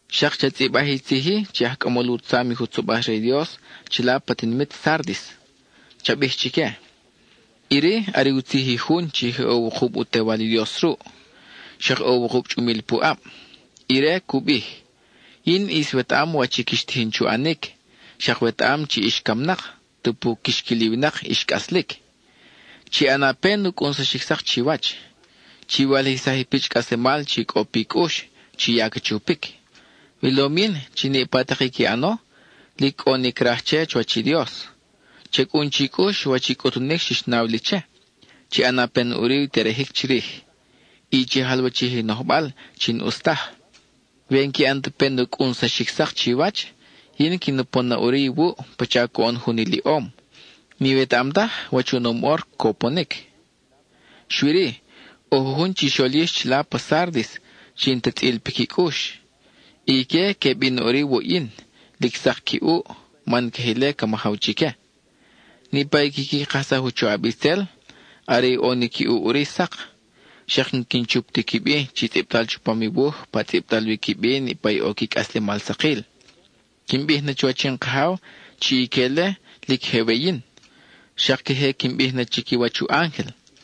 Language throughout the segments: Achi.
Xak cha tzʼibaj i tzij-i che i aj cʼamol u tzam i jutzobaj re i Dios chila pa tinimit Sárdis; cha bij chique: “Iri are u tzij i jun chi je ʼo wukub u Tewal i Dios ruʼ; xak ʼo i wukub chʼumil pu ʼab. Ire cu bij: Yin ʼis wetaʼam wach i quix tijin chu ʼanic, xak wetaʼam chi ix camnak, tupu quix quil i winak ix cʼaslic. ¡Chi ʼana pen u cʼunsaxic sak chiwach! Chi walijsaj i pichʼ cʼaslemal chi cʼo pi cʼux chi ya ca chupic. Wilom yin chi niʼpa tak i qui ʼano lic cʼo ni craj che chuwach i Dios. Cha cʼun chi cʼux wach i cʼutunic xix naw li che; chi ʼana pen ʼuri i terejic chirij, y chi jalwachij i nojbal chi n-ʼus taj. We n-qui ʼan ta pen u cʼunsaxic sak chiwach, yin quin upon na ʼuri iwuʼ pacha coʼon jun iliʼom; n-iwetaʼam taj wach oʼonom ʼor cuponic. Xui-ri, ʼo jujun chixol yix chila pa Sárdis chi n-ta tzʼil piqui cʼux. Ique que bin na ʼuri wuʼ yin, lic sak qui ʼuʼ, man queje ile ca majaw chique. Niʼpa i quiqui kajsaj u choʼab itzel, are i ʼo ni qui ʼuʼ ʼuri sak. Xak n-quin chup ti qui bi chi tzʼibtal chupam i wuj pa tzʼibtal wi qui bi niʼpa i ʼo qui cʼaslemal sakil. Quin bij na chuwach in Kajaw chi ique-le lic je we yin, xak queje quin bij na chiquiwach u ángel.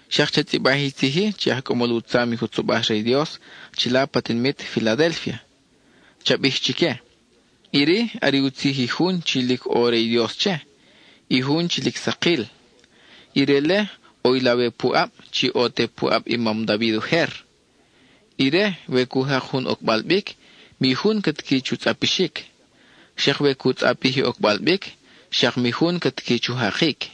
Xak cha tzʼibaj i tzij-i che i aj cʼamol u tzam i jutzobaj re i Dios chila pa tinimit Filadélfia; cha bij chique: “Iri are u tzij i jun chi lic ʼo re i Dios che, i jun chi lic sakil. Ire-le, ʼo i lawe pu ʼab chi ʼo te pu ʼab i mam David ujer. Ire, we cu jak jun ocbal bic, mi jun ca tiqui chu tzʼapixic; xak we cu tzʼapij i ocbal bic, xak mi jun ca tiqui chu jakic.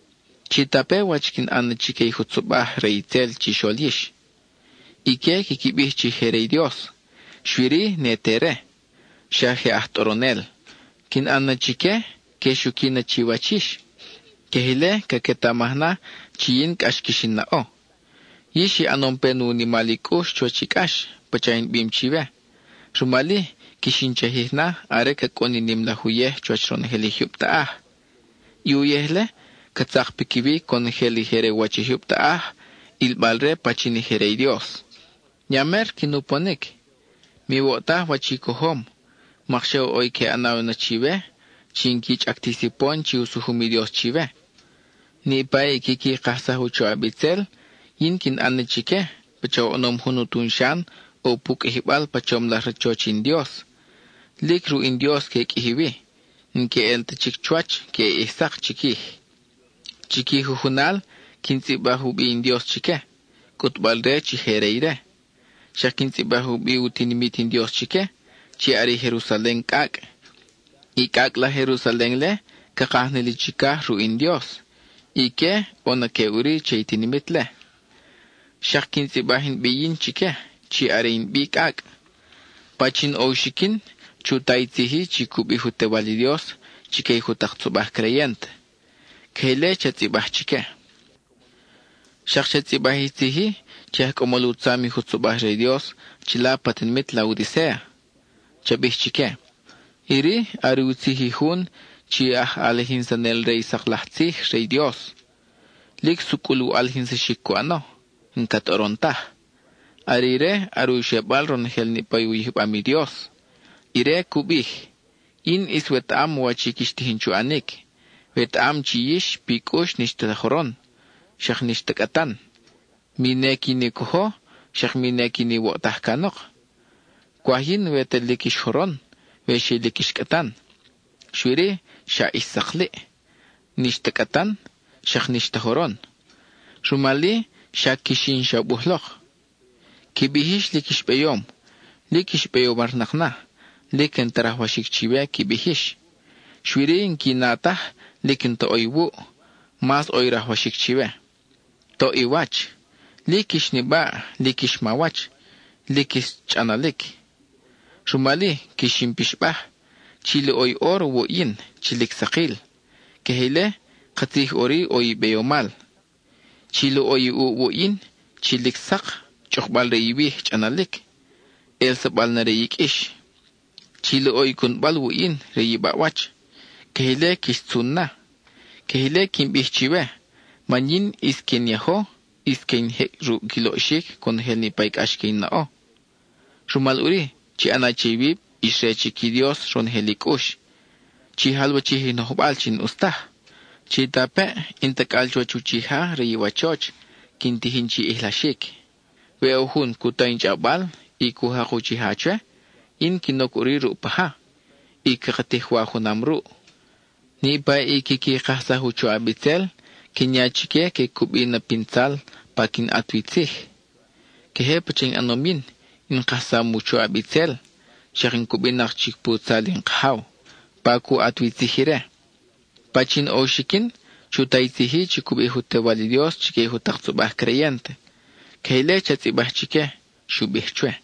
Chitape wach quin ʼan na chique i jutzobaj re itzel chixol yix. Ique quiqui bij chi je re i Dios, xui-ri, ne te re; xa je aj tʼoronel. Quin ʼan na chique que xuqui na chiwach yix. Queje ile, caquetamaj na chi yin cʼax quix in naʼo. Yix i ʼanom pen ʼo u nimal i cʼux chuwach i cʼax, pacha in bim chiwe; rumal-i, quix in chajij na are ca cʼun i nim laj uyej chuwach ronojel i jyub taʼaj. I uyej-le, ca tzak piquiwi conojel i je re u wach i jyub taʼaj, ʼilbal-re pachin i je re i Dios. Ya mer quin uponic. Miwoʼtaj wach i cojom, mokxa ʼo i que ʼanaw na chiwe chi n-qui chʼac ti sipon chi u sujum i Dios chiwe. Niʼpa i quiqui kajsaj u choʼab itzel, yin quin ʼan na chique pacha oʼonom jun utun xan ʼo pu qʼuijibal pa chom laj rachoch in Dios; lic ruʼ in Dios que qʼuiji wi, n-que ʼel ta chic chuwach queʼe ʼij sak chiquij. Chi qui jujunal, quin tzʼibaj u bi in Dios chique, cʼutbal-re chi je re ire. Xak quin tzʼibaj u bi u tinimit in Dios chique, chi are i Jerusalen cʼacʼ. I cʼacʼ laj Jerusalen-le ca kaj na li chicaj ruʼ in Dios, y ique, ʼo na que ʼuri che i tinimit-le. Xak quin tzʼibaj in bi yin chique, chi are in bi cʼacʼ. Pachin ʼo u xiquin, chu ta i tzij-i chi cu bij u Tewal i Dios chique i jutak tzobaj creyent.” (Queje ile cha tzʼibaj chique.) Xak cha tzʼibaj i tzij-i che i aj cʼamol u tzam i jutzobaj re i Dios chila pa tinimit Laodicéa; cha bij chique: “Iri are u tzij i jun chi aj ʼalijinsanel re i sak laj tzij re i Dios; lic sucʼul u ʼalijinsaxic cu ʼano, n-ca tʼoron taj. Are ire are u xebal ronojel niʼpa u yijbam i Dios. Ire cu bij: Yin ʼis wetaʼam wach i quix tijin chu ʼanic. Wetaʼam chi yix pi cʼux n-ix ta joron, xak n-ix ta cʼatan; mi ne quin i cojo, xak mi ne quin iwoʼtaj canok. Cwaj yin we ta lic ix joron, we xi lic ix cʼatan. Xui-ri, xa ix sakliʼ: n-ix ta cʼatan, xak n-ix ta joron; rumal-i, xa quix in xabuj lok. Qui bij yix lic ix beyom; lic ix beyomarnak na, lic n-ta rajwaxic chiwe qui bij yix, xui-ri n-qui na taj lic n-ta ʼo iwuʼ, mas ʼo i rajwaxic chiwe. ¡Toʼ i wach! lic ix nibaʼ, lic ix mawach, lic ix chʼanalic. Rumal-i, quix in pixbaj, chi loʼo i óro wuʼ yin chi lic sakil; queje ile, katzij ʼuri ʼo i beyomal. Chi loʼo i ʼuʼ wuʼ yin chi lic sak, chʼukbal re iwij chʼanalic, ʼelsabal na re i qʼuix. Chi loʼo i cunbal wuʼ yin re i baʼwach; queje ile quix tzun na. Queje ile quin bij chiwe, man yin ʼis que in yajo, y que in jecʼ ruʼ qui loʼxic conojel niʼpa i cʼax que in naʼo. Rumal ʼuri, chi ʼana che iwib ix re chic i Dios ronojel i cʼux; chi jalwachij i nojbal chi n-ʼus taj. Chitapeʼ, in tacʼal chuwach uchija re iwachoch, quin tijin chi ʼijlaxic. We ʼo jun cu ta in chʼawbal, y cu jak i uchija chwe, yin quin oc ʼuri ruʼ paja, y caka tij wa junam ruʼ. Niʼpa i quiqui kajsaj u choʼab itzel, quin ya chique que cubi na pin tzal pa quin ʼat wi tzij. Queje pacha in ʼanom yin, in kajsam u choʼab itzel, xak in cubinak chic pu tzal in Kajaw, pa cu ʼat wi tzij ire. Pachin ʼo u xiquin, chu ta i tzij-i chi cu bij u Tewal i Dios chique i jutak tzobaj creyent.” (Queje ile cha tzʼibaj chique, xu bij chwe.)